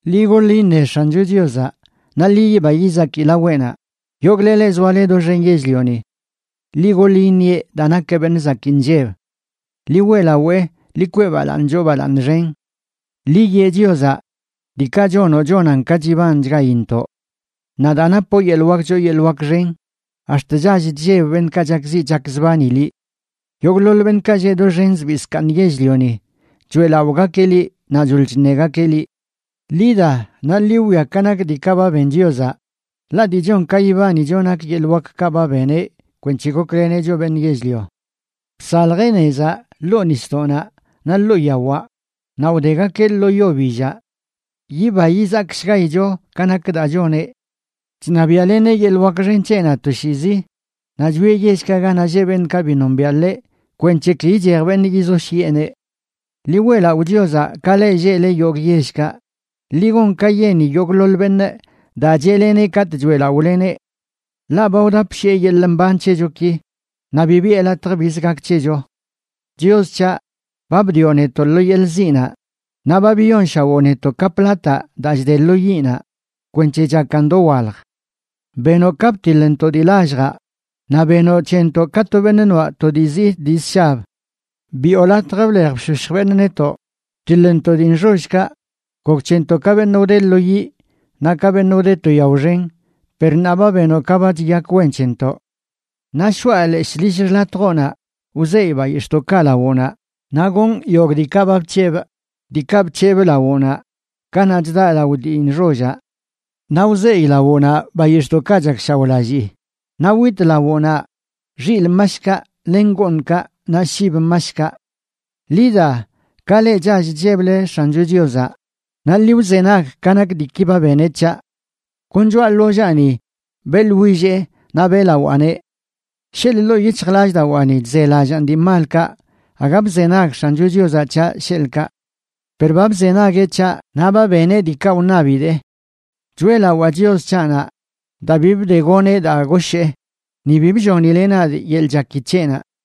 Ḻi goḻ iṉe X̱ancho Chiozaꞌ, naꞌ ḻi yiba yizaki laweꞌnaꞌ yogꞌle leꞌ zoale doxen yell-lioni. ¡Ḻi goḻ iṉieꞌ daa nakeꞌ beṉꞌ zakii nlleb! ¡Ḻi weꞌlawee, ḻi kwee balaaṉ choo balaaṉ xen. Ḻi yee Chiozaꞌ: “¡Diikaꞌ chonoꞌ, chonan ka chibanchgaintoꞌ! Naꞌ daa napoꞌ yeḻꞌ wak choo yeḻꞌ wak xen, ax̱t chall chlleb beṉꞌkaꞌ chakziꞌ chakzbani liꞌ. Yogꞌḻoḻ beṉꞌkaꞌ lleꞌ doxen zbii zkaaṉ yell-lioni choeꞌlaꞌogakeꞌ liꞌ, naꞌ choḻ chṉegakeꞌ liꞌ.” Ḻi da, naꞌ ḻi wwia ka nak diikaꞌ ba ben Chiozaꞌ, ḻaꞌ dii chon ka yibanicho nak yeḻꞌ wakkaꞌ ba beneꞌ kwenc̱he gokleneꞌ choꞌ beṉꞌ yell-lio. Bsaljeꞌ nezaꞌ ḻoo nisdoꞌnaꞌ naꞌ ḻoo yawaꞌ naꞌ wdegakeꞌ lo yo billaꞌ. Yiba yizakshgaicho ka nak daa choneꞌ. Chṉabiaꞌleneꞌ yeḻꞌ wak xen c̱heꞌnaꞌ toshiizi; naꞌ chwieꞌ yellkaꞌ ganaꞌ lleꞌ beṉꞌkaꞌ bi nombiaꞌ ḻeꞌ kwenc̱he ki ichej beṉꞌ yizoshyiꞌeneꞌ. Ḻi weꞌlaꞌo Chiozaꞌ, ka leꞌ lleꞌle yogꞌ yellkaꞌ, ḻi gon ka yeni yogꞌḻoḻ beṉꞌ daa cheꞌleneꞌ katꞌ choeꞌlaꞌoleneꞌ. Ḻaꞌ ba wdapshiꞌe yeḻꞌ mban c̱hechoki, naꞌ bi biꞌe latj biz gak c̱hecho. Chios c̱haꞌ, ba bdioꞌ netoꞌ lo yeḻꞌ ziꞌnaꞌ, naꞌ ba biyonshawoꞌ netoꞌ ka plataꞌ daa chde lo yiꞌnaꞌ kwenc̱he chakan dowalj. Benoꞌ ka btiḻntoꞌ dii lalljaꞌ, naꞌ benoꞌ c̱hentoꞌ ka to beṉꞌ noaꞌ to dii zii dii zshab. Biꞌo latj blej bshoshj beṉꞌ netoꞌ; btiḻntoꞌ dii nxollkaꞌ, gok c̱hentoꞌ ka beṉꞌ wde lo yiꞌ naꞌ ka beṉꞌ wde to yao xen, per ṉaa ba benoꞌ ka ba chiyak wen c̱hentoꞌ. Naꞌ shoꞌa leshꞌ lill xḻatjoꞌnaꞌ, wzeyꞌ bayix̱ꞌdoꞌkaꞌ lawoꞌnaꞌ, naꞌ gonꞌ yogꞌ diikaꞌ ba bc̱hebꞌ, diikaꞌ bc̱hebꞌ lawoꞌnaꞌ kanaꞌ chdaꞌ lao dii nxollaꞌ. Naꞌ wzeyꞌ lawoꞌnaꞌ bayix̱ꞌdoꞌkaꞌ chakshaoꞌlallii, naꞌ witꞌ lawoꞌnaꞌ xilꞌ mashkaꞌ len gooṉkaꞌ naꞌ shib mashkaꞌ. Ḻi da, ka le chall chlleble X̱ancho Chiozaꞌ naꞌ ḻi wzenag ka nak diiki ba beneꞌ c̱haꞌ. Kon choꞌa ḻollaani beꞌḻwillee naꞌ beꞌlawaaneꞌ. Sheḻꞌ ḻoo yic̱hjlallꞌdawaani chzelallaan dii malkaꞌ, aga bzenag X̱ancho Chiozaꞌ c̱haꞌ sheḻꞌkaꞌ. Per ba bzenagueꞌ c̱haꞌ naꞌ ba beneꞌ diikaꞌ wṉabidee. Choeꞌlawaa Chios c̱haꞌnaꞌ daa bi bdegoneꞌ daa goshee, ni bi bllonileꞌ nadꞌ yeḻꞌ chaki c̱heꞌnaꞌ.